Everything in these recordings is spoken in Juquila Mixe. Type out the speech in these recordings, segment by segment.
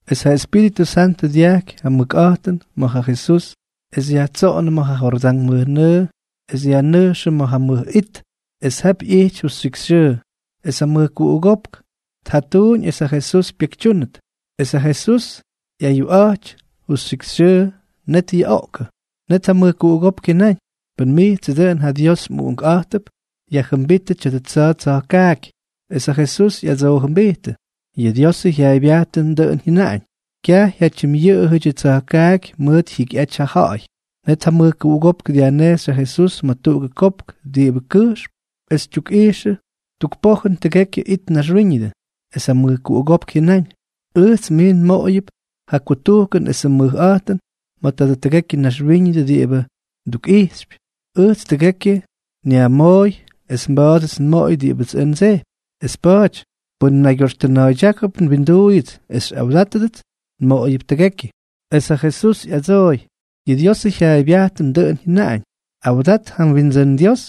Es ja Espíritʉ Santʉ dyajky ja mʉkꞌa̱jtʉn ma̱ ja Jesús, es yajtsoꞌonʉ ma̱ ja Jordán mʉjnʉʉ es yajnʉjxʉ ma̱ ja mʉj it. Es jap ꞌyijty justyikxyxyʉʉ. Es ja mʉjkuꞌugópk tjatuuñ es ja Jesús pyekytyúnʉt. Es ja Jesús ꞌyayuꞌa̱jty justyikxyxyʉʉ, net yuꞌoꞌkʉ. Net ja mʉjkuꞌugópk jyʉnáñ: —Pʉn mijtsʉ dʉꞌʉn ja Dios mꞌUꞌunkꞌa̱jtʉp, yajjʉmbítʉ tya̱dʉ tsa̱a̱ tsa̱jkaaky. Es ja Jesús ꞌyadsoojʉmbijtʉ: —Yʉ Diosʉ jyaaybyajtʉn dʉꞌʉn jyʉnaꞌañ: “Kyaj jyatyimꞌyʉꞌʉyʉdyʉ tsa̱jkaaky mʉʉt jyikyꞌaty ja ja̱ꞌa̱y.” Net ja mʉjkuꞌugópk dyajnejxy ja Jesús ma̱ tuꞌugʉ kopk diꞌibʉ kʉjxm es tyukꞌijxʉ tuk pojʉn tʉgekyʉ it naxwíñʉdʉ. Es ja mʉjkuꞌugópk jyʉnáñ: —Ʉjts mij nmoꞌoyʉp ja kutujkʉn esʉ mʉjꞌa̱jtʉn ma̱ tʉgekyʉ naxwíñʉdʉ diꞌibʉ ndukꞌijxypy. Ʉjtsʉ tʉgekyʉ nyajmooy, es mba̱a̱dʉts nmoꞌoy diꞌibʉts ʉj ndsejpy. Es pa̱a̱ty pʉn mnaygyoxtʉna̱a̱ydyákʉp nwinduuyʉts es xyꞌawdátʉdʉts, nmoꞌoyʉp tʉgekyʉ. Es ja Jesús ꞌyadsooy: —Yʉ Diosʉ jyaaybyajtʉn dʉꞌʉn jyʉnaꞌañ: “Awdat ja mWindsʉ́n Dios,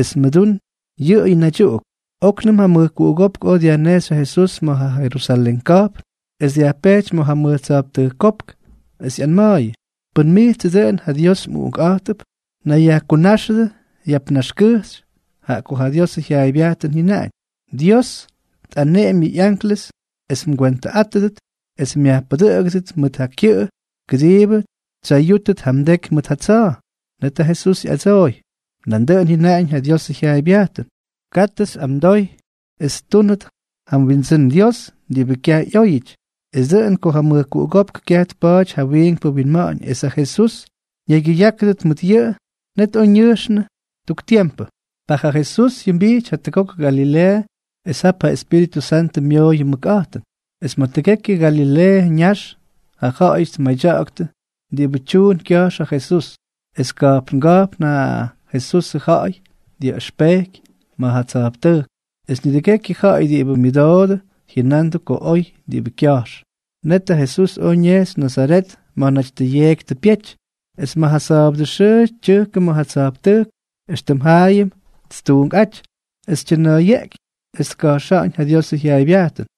es mʉdún yʉꞌʉ naydyuꞌuk.” Oknʉm ja mʉjkuꞌugópk oj dyajnejxy ja Jesús ma̱ ja Jerusalén ka̱jpn es dyajpejty ma̱ mʉj tsa̱jptʉjk kopk es ꞌyanma̱a̱yʉ: —Pʉn mijtsʉ dʉꞌʉn ja Dios mꞌUꞌunkꞌa̱jtʉp, nayyajkunáxʉdʉ yap naxkʉjxy, jaꞌa ko ja Diosʉ jyaaybyajtʉn jyʉnaꞌañ: Dios tꞌaneꞌemy yʉ anklʉs es mgwentʉꞌátʉdʉt, es myajpʉdʉꞌʉgʉdʉt mʉt ja kyʉꞌʉ kʉdiibʉ tsyayútʉt ja mdeky mʉt ja tsa̱a̱. Net ja Jesús ꞌyadsooy: —Nandʉꞌʉn jyʉnaꞌañ ja Diosʉ jyaaybyajtʉn: “Katʉ xyꞌamdoy es ttúnʉt ja mWindsʉ́n Dios diꞌibʉ kyaj ꞌyóyʉty.” Es dʉꞌʉn ko ja mʉjkuꞌugópk kyaj tpaty ja wiinkpʉ winma̱ꞌa̱ñ es ja Jesús ñaygyʉyákʉdʉt mʉt yʉꞌʉ, net oj ñʉjxnʉ tuk tiempʉ. Ta ja Jesús jyʉmbijty jatʉgok Galileeʉ es ja Espíritʉ Santʉ myooyʉ mʉkꞌa̱jtʉn. Es ma̱ tʉgekyʉ ja Galileeʉ ñax ja ja̱ꞌa̱yʉty tmadyaktʉ diꞌibʉ tyuun kya̱jx ja Jesús. Es ka̱jpnga̱jpn ja Jesusʉ ja̱ꞌa̱y dyaꞌʉxpejky ma̱ ja tsa̱jptʉjk, es nidʉgekyʉ ja̱ꞌa̱y diꞌibʉ myʉdoodʉ jyʉnandʉ ko oy diꞌibʉ kya̱jx. Net ja Jesús oj ñejxy Nazaret, ma̱ naty tʉ yeeky tʉ pyety. Es ma̱ ja sa̱a̱bʉdʉ xʉʉ tyʉjkʉ ma̱ ja tsa̱jptʉjk, éxtʉm jaayʉm ttuunkꞌáty, es tyʉna̱a̱yeꞌky es tka̱jxa̱ꞌa̱ñ ja Diosʉ jyaaybyajtʉn.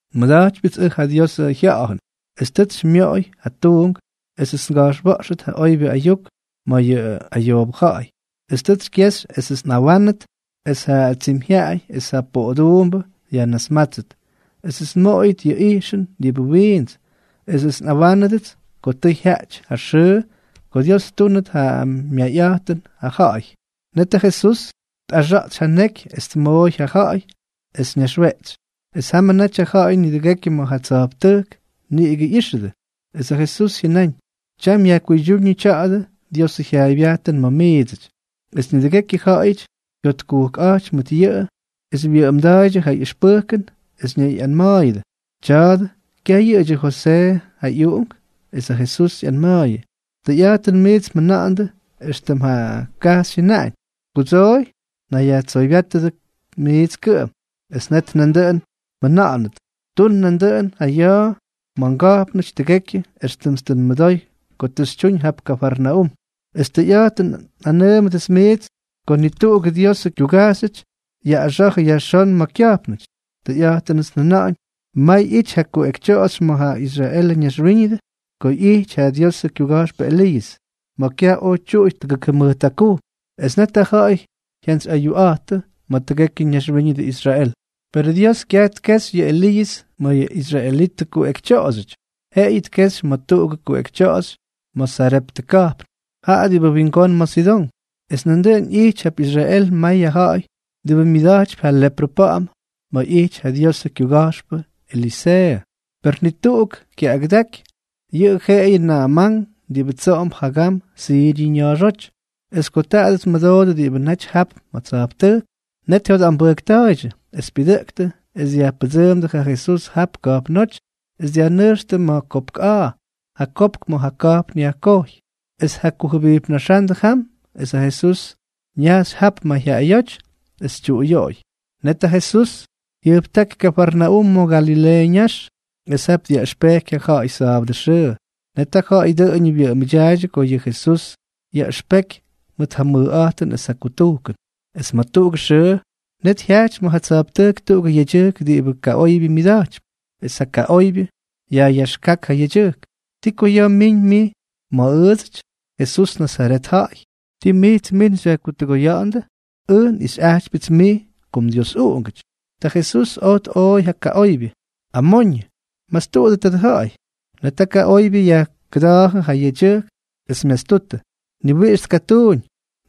Nmʉda̱jtypyʉts ʉj ja Diosʉ Jya̱ꞌa̱jʉn, es tʉts xymyoꞌoy ja tuunk esʉts nga̱jxwa̱ꞌxʉt ja oybyʉ ayuk ma̱ ja ayoobʉ ja̱ꞌa̱y. Es tʉts xykyexy esʉts nꞌawánʉt es ja tsimyjyaꞌay es ja poꞌoduumbʉ yajnasmátsʉt, esʉts nmoꞌoyʉt yʉ ꞌyijxʉn diꞌibʉ wiints, esʉts nꞌawánʉdʉts ko tʉ jyaꞌty ja xʉʉ ko Dios ttúnʉt ja myayꞌa̱jtʉn ja ja̱ꞌa̱y. Net ja Jesús tꞌaxa̱a̱tsy ja neky es tmooy ja ja̱ꞌa̱y es ñaxweꞌtsy. Es jamʉ naty ja ja̱ꞌa̱y nidʉgekyʉ ma̱ ja tsa̱jptʉjk niꞌigʉ ꞌyijxʉdʉ. Es ja Jesús jyʉnáñ: —Tyam yajkuydyúñʉ tya̱dʉ Diosʉ jyaaybyajtʉn ma̱ miidsʉty. Es nidʉgekyʉ ja̱ꞌa̱yʉty jyotkujkꞌa̱jty mʉt yʉꞌʉ es wyʉꞌʉmda̱a̱ydyʉ ja ꞌyʉxpʉjkʉn es ñayꞌanma̱a̱yʉdʉ: —Tya̱a̱dʉ, ¿kyaj yʉꞌʉdyʉ Josee ja ꞌyuꞌunk? Es ja Jesús ꞌyanma̱a̱yʉ: —Tʉyꞌa̱jtʉn miits mjʉna̱ꞌa̱na̱ꞌa̱ndʉ éxtʉm ja kajxy jyʉnáñ: “Kudsooy, nayyajtsoybyátʉdʉ mijts kʉꞌʉm.” Es net nandʉꞌʉn mjʉna̱ꞌa̱nʉt: “Tun nandʉꞌʉn ja ya̱a̱ ma̱ mga̱jpnʉty tʉgekyʉ éxtʉmts tʉ nmʉdoy ko tʉ xytyuñ jap Kafarnaúm.” Es tʉyꞌa̱jtʉn nꞌanʉʉmʉts miidsʉty ko ni tuꞌugʉ Diosʉ kyugajxy yaꞌꞌaxa̱jʉ yajxón ma̱ kya̱jpnʉty. Tʉyꞌa̱jtʉnʉts njʉna̱ꞌa̱ñ, may ꞌyijty ja kuꞌekytyoꞌoxy ma̱ ja Israelʉ ñaxwíñʉdʉ ko ꞌyijty ja Diosʉ kyuga̱jxpʉ Eliiʉs, ma̱ kyaj oj tyuꞌuy tʉgʉk jʉmʉjt jakujm. Es net ja ja̱ꞌa̱y jyantsyꞌayuꞌa̱jttʉ ma̱ tʉgekyʉ ñaxwíñʉdʉ Israel. Perʉ Dios kyaj tkejxy yʉ Eliiʉs ma̱ yʉ israelitʉ kuꞌekytyoꞌoxyʉty, jeꞌeyʉ tkejxy ma̱ tuꞌugʉ kuꞌekytyoꞌoxy ma̱ Sareptʉ ka̱jpn, jaꞌa diꞌibʉ wingón ma̱ Sidón. Es nandʉꞌʉn ꞌyijty jap Israel may ja ja̱ꞌa̱y diꞌibʉ myʉda̱jtypy ja leprʉ pa̱ꞌa̱m ma̱ ꞌyijty ja Diosʉ kyuga̱jxpʉ Eliseeʉ. Per ni tuꞌuk kyaꞌꞌagʉdaky, yʉꞌʉ jeꞌeyʉ Na̱a̱mán diꞌibʉ tsoꞌomp jagam Siryʉ ña̱a̱xóty. Es ko taadʉ tmʉdoodʉ diꞌibʉ naty jap ma̱ tsa̱jptʉjk, net jyotꞌambʉjkta̱a̱ydyʉ, es pyʉdʉꞌktʉ es dyajpʉdsʉʉmdʉ ja Jesús jap ka̱jpnóty es dyajnʉjxtʉ ma̱ kopk a̱a̱, ja kopk ma̱ ja ka̱jpn yajkojy, es tjakujʉbijpnaxándʉ jam. Es ja Jesús ñajxy jap mayjyaꞌayóty es tyuꞌuyoꞌoy. Net ja Jesús jyʉjptáky Kafarnaúm ma̱ Galileeʉ ñax, es jap dyaꞌʉxpejky ja ja̱ꞌa̱y sa̱a̱bʉdʉ xʉʉ. Net ja ja̱ꞌa̱y dʉꞌʉñʉ wyʉꞌʉmʉdyaaydyʉ ko yʉ Jesús yaꞌʉxpeky mʉt ja mʉkꞌa̱jtʉn es ja kutujkʉn. Es ma̱ tuꞌugʉ xʉʉ, net jyajty ma̱ ja tsa̱jptʉjk tuꞌugʉ yedyʉjk diꞌibʉ kaꞌoybyʉ myʉda̱jtypy. Es ja kaꞌoybyʉ yajꞌyaxkák ja yedyʉjk: —¿Ti ko ya̱a̱ mmiñ mij ma̱ ʉʉdsʉty, Jesús, Nazaret ja̱ꞌa̱y? ¿Ti mijts min xyajkutʉgoya̱ꞌa̱ndʉ? Ʉj nꞌixyꞌajtypyʉts mij ko mDiosꞌuꞌungʉty. Ta Jesús oj tꞌooy ja kaꞌoybyʉ: —¡Amoñʉ! ¡Mastuꞌudʉ tadʉ ja̱ꞌa̱y! Net ja kaꞌoybyʉ yajkʉda̱a̱jʉ ja yedyʉjk es myastutʉ, ni wiꞌix tkatuuñ.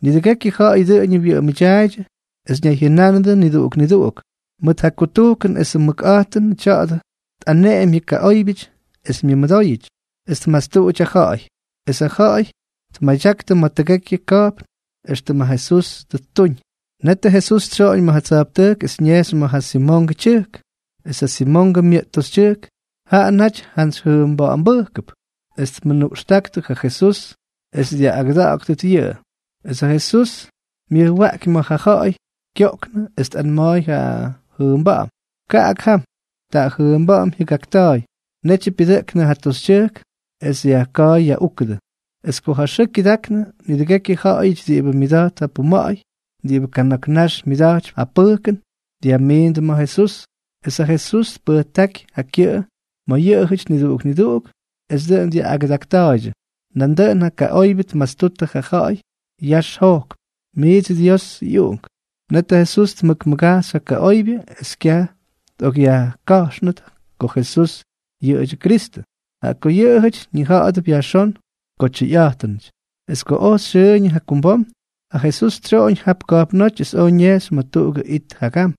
Nidʉgekyʉ ja̱ꞌa̱y dʉꞌʉñʉ wyʉꞌʉmʉdyaaydyʉ, es ñayjyʉnánʉdʉ niduꞌuk niduꞌuk: —¡Mʉt ja kutujkʉn esʉ mʉkꞌa̱jtʉnʉ tya̱a̱dʉ tꞌaneꞌemy yʉ kaꞌóybyʉty es myʉmʉdóyʉty, es tmastuꞌuty ja ja̱ꞌa̱y! Es ja ja̱ꞌa̱y tmadyaktʉ ma̱ tʉgekyʉ ka̱jpn éxtʉm ja Jesús tʉ ttuñ. Netʉ Jesús tsyoꞌoñ ma̱ ja tsa̱jptʉjk es ñejxy ma̱ ja Simongʉ tyʉjk. Es ja Simongʉ myʉꞌt toxytyʉjk, jaꞌa naty jantsy jʉʉmba̱ꞌa̱mbʉjkʉp, es tmʉnuꞌxtáktʉ ja Jesús es dyaꞌꞌagʉda̱ꞌa̱gʉt yʉꞌʉ. Es ja Jesús myʉjwaꞌky ma̱ ja ja̱ꞌa̱y kyoꞌknʉ es tꞌanma̱a̱y ja jʉʉmba̱ꞌa̱m: —Kaꞌak jam. Ta ja jʉʉmba̱ꞌa̱m jyʉgakta̱a̱y. Netyʉ pyʉdʉꞌknʉ ja toxytyʉjk es yajka̱a̱y yaꞌúkʉdʉ. Es ko ja xʉʉ kyʉdaknʉ, nidʉgekyʉ ja̱ꞌa̱yʉty diꞌibʉ myʉda̱jt ja puma̱ꞌa̱y, diꞌibʉ kana̱k nax myʉda̱jtypy ja pʉjkʉn, dyajmiindʉ ma̱ Jesús. Es ja Jesús tpʉjtáky ja kyʉꞌʉ ma̱ yʉꞌʉjʉty niduꞌuk niduꞌuk es dʉꞌʉn dyaꞌꞌagʉdakta̱a̱ydyʉ. Nandʉꞌʉn ja kaꞌoybyʉ tmastuttʉ ja ja̱ꞌa̱y yax jojkp: —Mijts Diosʉ ꞌyUꞌunk. Net ja Jesús tmʉkmʉgajxy ja kaꞌoybyʉ es kyaj tꞌokꞌyajka̱jxnʉt ko Jesús yʉꞌʉdyʉ Kristʉ, jaꞌa ko yʉꞌʉjʉty ñija̱ꞌa̱dʉp yajxón ko tyʉyꞌa̱jtʉnʉty. Es ko oj xyʉʉñʉ jakumbom, ja Jesús tsyoꞌoñ jap ka̱jpnóty es oj ñejxy ma̱ tuꞌugʉ it jagam.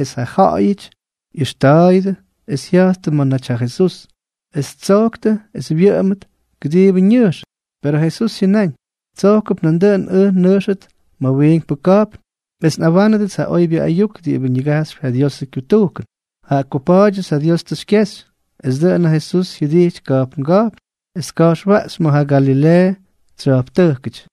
Es ja ja̱ꞌa̱yʉty ꞌyʉxta̱a̱yʉdʉ, es jya̱jttʉ ma̱ naty ja Jesús, es ttsojktʉ es wyʉꞌʉmʉt, kʉdiibʉ ñʉjxʉt. Per ja Jesús jyʉnáñ: —Tsojkʉp nandʉꞌʉn ʉj nnʉjxʉt ma̱ wiinkpʉ ka̱jpn es nꞌawánʉdʉts ja oybyʉ ayuk diꞌibʉ ñigajxypy ja Diosʉ kyutujkʉn, jaꞌa ko pa̱a̱dyʉts ja Dios tʉ xykyexy. Es dʉꞌʉn ja Jesús jyʉdijty ka̱jpnga̱jpn es tka̱jxwaꞌxy ma̱ ja Galileeʉ tsya̱jptʉjkʉty.